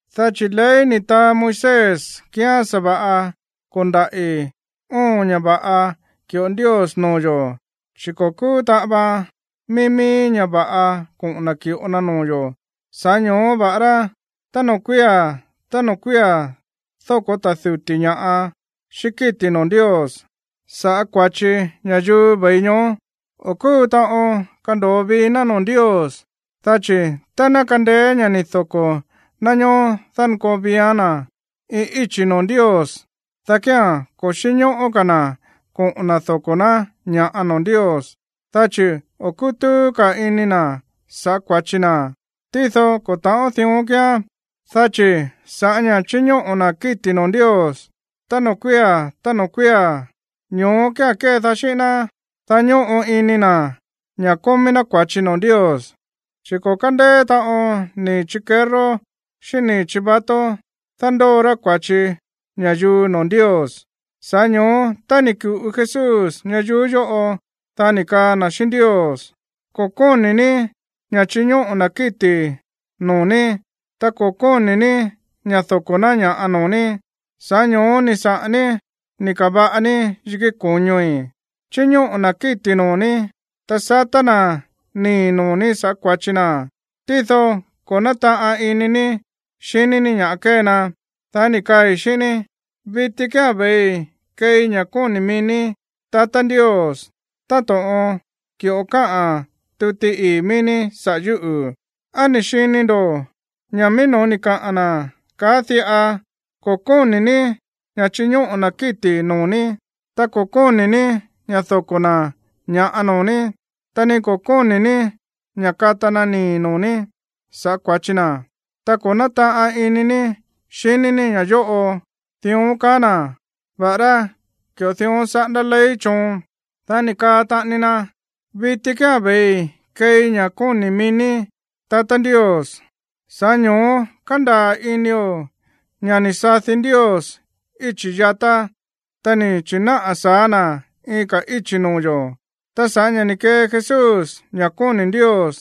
Dá chi̱ ley ni̱ taa Moisés kíán sa̱va̱ꞌa ko̱ndaꞌi̱ óon ña̱ va̱ꞌa ki̱ꞌo Ndios noo̱ yo̱, chi̱ ko̱ kúu taꞌan vaan mií mií ña̱ va̱ꞌa koꞌo̱n na̱ ki̱ꞌo na noo̱ yo̱. Sa̱ꞌá ño̱ó va̱ꞌará tá noo̱ kuía̱ tá noo̱ kuía̱ dóko̱ ta̱ duti̱ ña̱ꞌa xíꞌín kíti̱ noo̱ Ndios sa̱ꞌá kua̱chi ña̱yuu ve̱i ñoó, o̱ kúu taꞌon kando̱o vii ná noo̱ Ndios. Dá chi̱ tá ná kandeé ña̱ ni̱ doko̱ ná ñoó dánkoo viián na̱ iin íchi̱ noo̱ Ndios, dá kía̱n ko̱ xínñóꞌó ka̱ na̱ koꞌo̱n na̱ doko̱ ná ña̱ꞌa noo̱ Ndios, dá chi̱ o̱ kútúú ka̱ ini na̱ sa̱ꞌá kua̱chi na. Tído ko̱ ta̱ꞌón dión kíán, dá chi̱ sa̱ꞌá ña̱ chíñóꞌo̱ na̱ kíti̱ noo̱ Ndios tá noo̱ kuía̱ tá noo̱ kuía̱, ño̱ó kía̱n kédaá xíꞌín ná, dá ñóꞌo ini na̱ ña̱ kómí ná kua̱chi noo̱ Ndios. Chi̱ ko̱ kándeé taꞌon nii̱ chikerró xíꞌín nii̱ chivato dándóo rá kua̱chi ña̱yuu noo̱ Ndios. Sa̱ꞌá ño̱ó, tá ni̱ ku̱ꞌu Jesús ñayuú yóꞌo, dá ni̱ kaa na̱ xíꞌín Ndios: Ko̱ kóni̱ ní ña̱ chiñóꞌo̱ na̱ kíti̱ noo̱ ní, ta ko̱ kóni̱ ní ña̱ doko̱ ná ña̱ꞌa noo̱ ní. Sa̱ꞌá ño̱ó ni̱ saꞌa̱n ní ni̱ ka̱va̱ꞌa ní yikí ko̱ñoi̱. Chíñóꞌo̱ na̱ kíti̱ noo̱ ní, ta satá na̱ nii̱ noo̱ ní sa̱ꞌá kua̱chi na̱, tído ko̱ nátaꞌan ini ní xiní ní ña̱ kée na. Dá ni̱ kaai̱ xíꞌín ní: “Viti kía̱n ve̱ii keei ña̱ kóni̱ mií ní, tatá Ndios, táto̱ꞌon ki̱ꞌo káꞌa̱n tuti ii̱ mií ní saꞌa̱ yúꞌu̱.” ¿Á ni̱ xini ndo̱ꞌó? Ña̱ mií no̱ó ni̱ kaa na̱ káꞌa̱n diꞌa: “Ko̱ kóni̱ ní ña̱ chiñóꞌo̱ ná kíti̱ noo̱ ní, ta ko̱ kóni̱ ní ña̱ doko̱ ná ña̱ꞌa noo̱ ní, ta ni ko̱ kóni̱ ní ña̱ kata na̱ nii̱ noo̱ ní sa̱ꞌá kua̱chi na̱, ta ko̱ nátaꞌan ini ní xiní ní ña̱ yóꞌo.” Dión kaá na̱, va̱ꞌará ki̱ꞌo dión saꞌándá ley choon. Dá ni̱ kaa taꞌani na: “Viti kía̱n ve̱ii keei ña̱ kóni̱ mií ní, tatá Ndios.” Sa̱ꞌá ño̱ó kándaa̱ inio̱ ña̱ ni̱ sadi Ndios íchi̱ yatá, ta ni̱ chi̱náꞌa̱ sa̱á na̱ iin ka̱ íchi̱ noo̱ yo̱. Ta sa̱ꞌá ña̱ ni̱ kee Jesús ña̱ kóni̱ Ndios,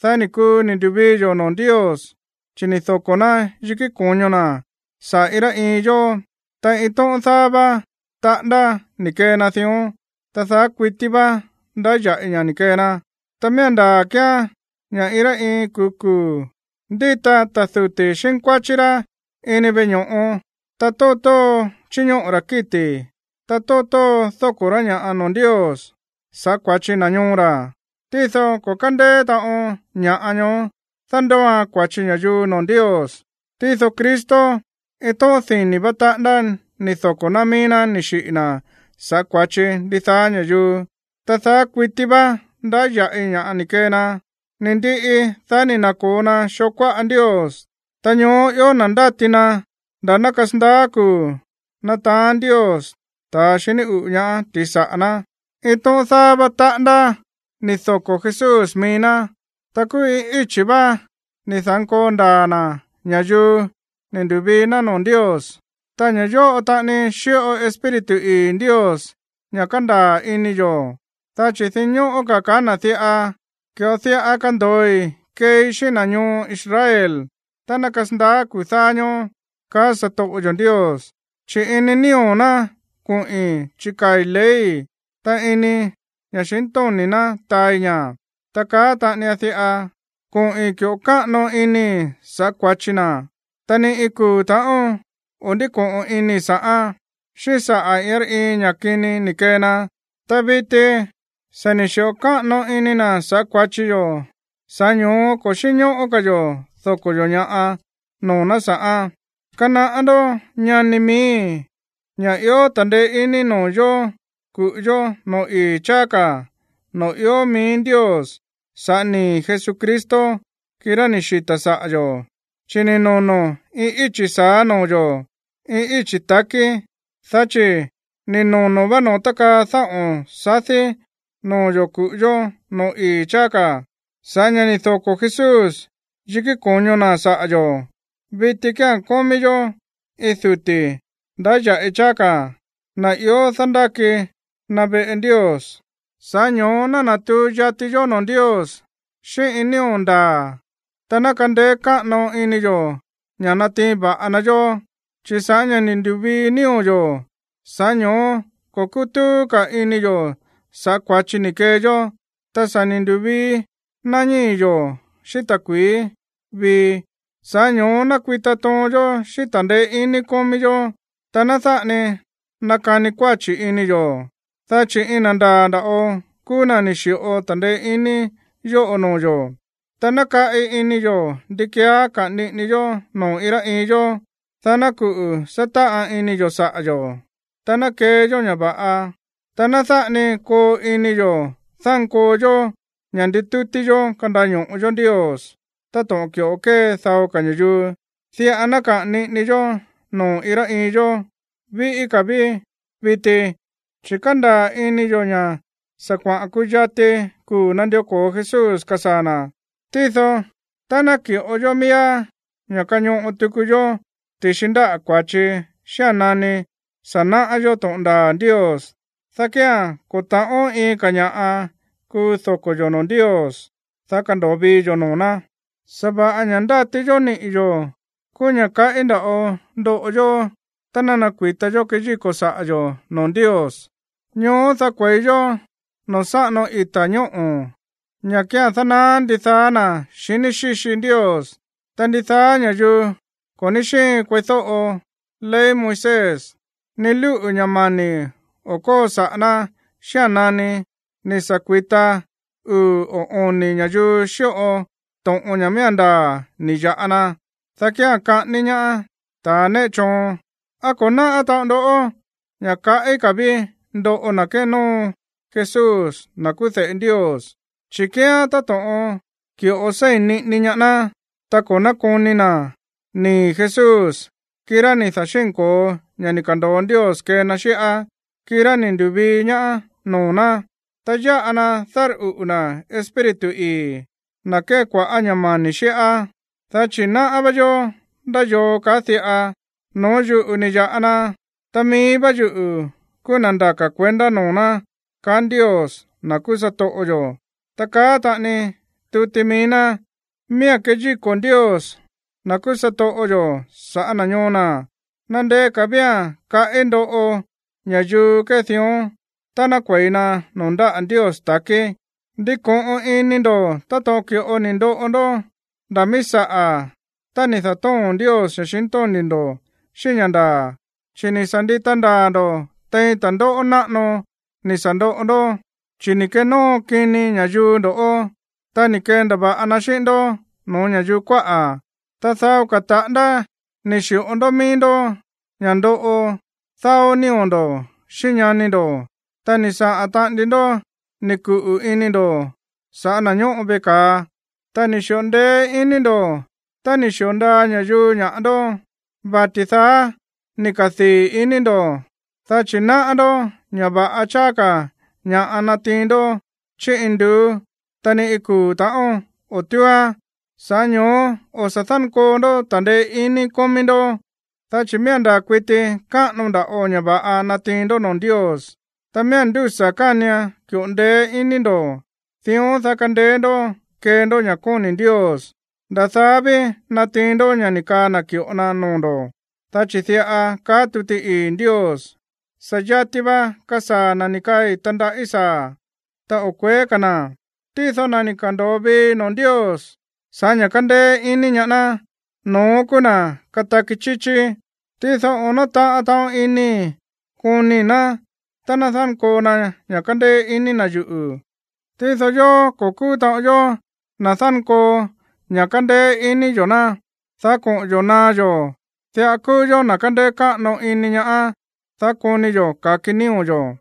dá ni̱ kuu ni̱ ndu̱vii yo̱ noo̱ Ndios, chi̱ ni̱ doko̱ ná yikí ko̱ño na̱ saꞌa̱ iin rá iin yó, ta iin tóꞌón dáá vá taꞌándá ni̱ kee na dión, ta daá kuití vá ndáya̱ꞌi ña̱ ni̱ kee na. Ta miía̱n ndaa̱ kíán ña̱ iin rá iin kuu̱ kuu̱ ndíta ta̱ duti̱ xínkuáchí rá ini veꞌe ño̱ꞌo, ta tóo tóo chíñóꞌo̱ ra̱ kíti̱, ta tóo tóo dóko̱ rá ña̱ꞌa noo̱ Ndios sa̱ꞌá kua̱chi na̱ ñoo ra̱. Tído ko̱ kándeé taꞌon ña̱ꞌa ñoó dándóoan kua̱chi ña̱yuu noo̱ Ndios. Tído Cristo, iin tóꞌón dini̱ vá taꞌándá ni̱ doko̱ ná mií ná ni̱ xiꞌi̱ na̱ sa̱ꞌá kua̱chi ndidaá ña̱yuu, ta daá kuití vá ndáya̱ꞌi ña̱ ni̱ kee na. Ni̱ ndiꞌi, dá ni̱ na̱ko̱o na xoo kuáꞌa Ndios. Ta ñoó ió na̱ ndáti na nda̱ ná kasandaá kuu̱ nataán Ndios ta̱ xiní uꞌu̱ ñaá ti̱xi saꞌa̱ ná. Iin tóꞌón dáá vá taꞌándá ni̱ doko̱ Jesús mií ná, ta kúú iin íchi̱ vá ni̱ da̱nkoo ndaa̱ na̱ ña̱yuu ni̱ ndu̱vii ná noo̱ Ndios. Ta ña̱ yóꞌo taꞌani xíꞌo Espíritu ii̱ Ndios ña̱ kándaa̱ ini yo̱, dá chi̱ dinñóꞌó ka̱ kaá na̱ diꞌa: Ki̱ꞌo diꞌa kando̱oi keei xíꞌín na̱ ñoo Israel tá ná kasandaá kuu̱ dáá ñóó, kaá satoꞌo yo̱ Ndios: Chi̱ ini nío̱ ná koꞌi̱n chikaa̱i̱ leyi̱, ta ini ña̱xintóni̱ ná taai ña̱. Ta kaá taꞌani na diꞌa: Koꞌi̱n ki̱ꞌo káꞌano inii̱ sa̱ꞌá kua̱chi na̱, ta ni iin kuu̱ ta̱ꞌón o̱ ndíko̱ꞌon inii̱ sa̱ꞌán, xíꞌín saꞌa̱ iin rá iin ña̱ kini ni̱ kee na. Ta viti, sa̱ ni̱ xi̱ꞌo káꞌano ini na̱ sa̱ꞌá kua̱chi yo̱, sa̱ꞌá ño̱ó ko̱ xínñóꞌó ka̱ yo̱ doko̱ yo̱ ña̱ꞌa noo̱ ná sa̱ꞌán. Kanaꞌá ndó, ñani miíi̱, ña̱ ió ta̱ndeé iní noo̱ yo̱ ku̱ꞌu yó noo̱ ii̱ cháá ka̱, noo̱ ió mií Ndios sa̱ꞌá nii̱ Jesucristo, kirá ni̱ xita̱ saꞌa̱ yo̱. Chi̱ ni̱ nono̱ iin íchi̱ sa̱á noo̱ yo̱, iin íchi̱ ta̱kí, dá chi̱ ni̱ nono̱ vá noo̱ tákaa dáꞌo̱n sadí noo̱ yo̱ ku̱ꞌu yó noo̱ ii̱ cháá ka̱ sa̱ꞌá ña̱ ni̱ doko̱ Jesús yikí ko̱ño na̱ saꞌa̱ yo̱. Viti kía̱n kómí yó iin duti̱ ndáya̱ꞌi cháá ka̱, na̱ ió dándáki na̱ veꞌe Ndios, sa̱ꞌá ño̱ó ná natuu yati yó noo̱ Ndios xíꞌín iin nío̱ ndaa̱, ta ná kandeé káꞌano ini yo̱ ña̱ natiin va̱ꞌa na yó, chi̱ sa̱ꞌá ña̱ ni̱ ndu̱vii nío̱ yo̱, sa̱ꞌá ño̱ó ko̱ kútúú ka̱ ini yo̱ sa̱ꞌá kua̱chi ni̱ kee yó, ta sa̱ ni̱ ndu̱vii na ñíi̱ yo̱ xíꞌín ta̱kui̱í vii. Sa̱ꞌá ño̱ó ná kui̱ta toon yó xíꞌín ta̱ndeé iní kómí yó, ta ná dáꞌa ni nakani kuáchi̱ ini yo̱, dá chi̱ iin na̱ ndaa̱ nda̱ꞌo kúú na̱ ni̱ xi̱ꞌo ta̱ndeé iní yóꞌo noo̱ yo̱. Ta ná kaꞌi ini yo̱ ndi keeá kaꞌa̱n niꞌini yó noo̱ iin rá iin yó, dá ná kuꞌu̱ sátáꞌan ini yo̱ saꞌa̱ yo̱, ta ná kee yó ña̱ va̱ꞌa. Ta ná dáꞌa ni koo ini yo̱ dánkoo yó ña̱ nditútí yó kandaño̱ꞌo yó Ndios táto̱ꞌon ki̱ꞌo kée dao ka̱ ña̱yuu. Diꞌa ná kaꞌa̱n niꞌini yó noo̱ iin rá iin yó, víꞌí ka̱ ví viti, chi̱ kándaa̱ ini yo̱ ña̱ sa̱ kuaꞌa̱n kuyati kuu̱ nandió ko̱o Jesús kasaa̱ na̱. Tído tá ná ki̱ꞌo yó miíá ña̱ kañoꞌo tuku yó ti̱xi ndáꞌa̱ kua̱chi xía̱n nani sa̱ náꞌá yó to̱ꞌon ndaa̱ Ndios, dá kía̱n ko̱ ta̱ꞌón iin ka̱ ña̱ꞌa kuu doko̱ yo̱ noo̱ Ndios, dá kando̱o vii yo̱ noo̱ ná. Sa̱va̱ꞌa ña̱ ndáti yó niꞌi̱ yo̱ kúú ña̱ kaꞌí nda̱ꞌo ndoꞌo yó tá ná kui̱ta yó keyíko̱ saꞌa̱ yo̱ noo̱ Ndios. Ñoó, dá kue̱i yó noo̱ sáꞌano ita̱ ñóꞌo̱, ña̱ kía̱n dánaá ndidaá na̱ xiní xíxi Ndios. Ta ndidaá ña̱yuu ko̱ ní xíin kueídóꞌo ley Moisés, ni lúꞌu̱ ña̱ mani̱ o̱ kóo saꞌa̱ ná xía̱n nani ni̱ sa̱ kui̱ta uu̱ o oni̱ ña̱yuu xíꞌo to̱ꞌon ña̱ miía̱n ndaa̱ ni̱ ya̱ꞌa na, dá kía̱n kaꞌání ñaá ta̱ néꞌe choon. ¿Á ko̱ náꞌá taꞌon ndó ña̱ kaꞌí ka̱ ví ndoꞌo na̱ kénóo Jesús, na̱ kúú de̱ꞌe Ndios? Chi̱ kíán táto̱ꞌon ki̱ꞌo séi̱n niꞌini ñaá ná, ta ko̱ nákoni na̱ nii̱ Jesús, kirá ni̱ da̱xínko̱o ña̱ ni̱ ka̱ndo̱o Ndios kee na xíꞌá, kirá ni̱ ndu̱vii ñaá noo̱ ná, ta yáꞌa na dárꞌuꞌu̱ na̱ Espíritu ii̱, na̱ kée kua̱ꞌá ña̱ mani̱ xíꞌá. Dá chi̱ náꞌá va̱ꞌa yó ndá yoo kaá diꞌa: “No̱ó yuꞌu̱ ni̱ ya̱ꞌa na, ta mií vá yuꞌu̱ kúú na̱ ndaka̱ kuendá noo̱ ná”, kaá Ndios, na̱ kúú satoꞌo yo̱. Ta kaá taꞌani tuti mií ná: “Miía̱n keyíko̱ Ndios, na̱ kúú satoꞌo yo̱, sa̱ꞌá na̱ ñoo na̱.” Nandeé ka̱ vía̱n kaꞌí ndoꞌo ña̱yuu kée dión tá ná kue̱i na noo̱ ndáꞌa̱ Ndios ta̱kí. Ndiko̱ꞌon ini ndo̱ táto̱ꞌon ki̱ꞌo ni̱ ndoꞌo ndó nda̱ míí saꞌa̱ tá ni̱ da̱tóo̱n Ndios ña̱xintóni̱ ndo̱ xíꞌín ña̱ ndaa̱, chi̱ ni̱ sa̱ ndita ndaa̱ ndo̱ tein ta̱ndóꞌó náꞌano ni̱ sa̱ ndoꞌo ndó. Chi̱ ni̱ kenóo kini ña̱yuu ndo̱ꞌó, ta ni̱ kendava̱ꞌa na xíꞌín ndó no̱ó ña̱yuu kuáꞌa̱, ta dao ka̱ taꞌándá ni̱ xi̱ꞌo ndó mií ndó ña̱ ndoꞌo dáó nío̱ ndo̱ xíꞌín ñani ndo̱. Ta ni̱ saꞌa̱n taꞌani ndó ni̱ kuꞌu̱ ini ndo̱ saꞌa̱ na̱ ñóꞌo veꞌe ka̱a. Ta ni̱ xi̱ꞌo ndeé iní ndo̱ tá ni̱ xi̱o ndaa ña̱yuu ña̱ꞌa ndó, vati̱ daá ni̱ kadii̱ iní ndo̱, dá chi̱ náꞌá ndó ña̱ va̱ꞌa cháá ka̱ ña̱ꞌa natiin ndó chí induú, ta ni iin kuu̱ ta̱ꞌón o̱ túúán. Sa̱ꞌá ño̱ó o̱ sa̱ dánkoo ndó ta̱ndeé iní kómí ndó, dá chi̱ miía̱n ndaa̱ kuiti káꞌano nda̱ꞌo ña̱ va̱ꞌa natiin ndó noo̱ Ndios. Ta miía̱n ndúsa̱ kánian ki̱ꞌo ndeé iní ndo̱, dión dá kandeé ndó kee ndó ña̱ kóni̱ Ndios, nda̱ daá ví natiin ndó ña̱ ni̱ kaa na̱ ki̱ꞌo na noo̱ ndo̱. Dá chi̱ diꞌa kaá tuti ii̱ Ndios: Sa̱ yati va kasaa̱ na̱ ni̱ kaai̱ tandaꞌí saa̱, ta o̱ kue̱é ka̱ na̱. Tído na̱ ni̱ ka̱ndo̱o vii noo̱ Ndios sa̱ꞌá ña̱ kándéé iní ñaá ná, no̱ón kúú na̱ kataki chíchí. Tído o̱ nátaꞌan taꞌon inii̱ konii̱ ná tá ná dánkoo na ña̱ kándéé iní ná yuꞌu̱. Tído yóó, ko̱ kúú taꞌon yó na̱ dánkoo ña̱ kándéé iní yo̱ ná, dá koꞌo̱n yo̱ naá yó. Diꞌa kúú yó na̱ kándéé káꞌano iní ñaá, dá koni yo̱ ka̱ki nío̱ yo̱.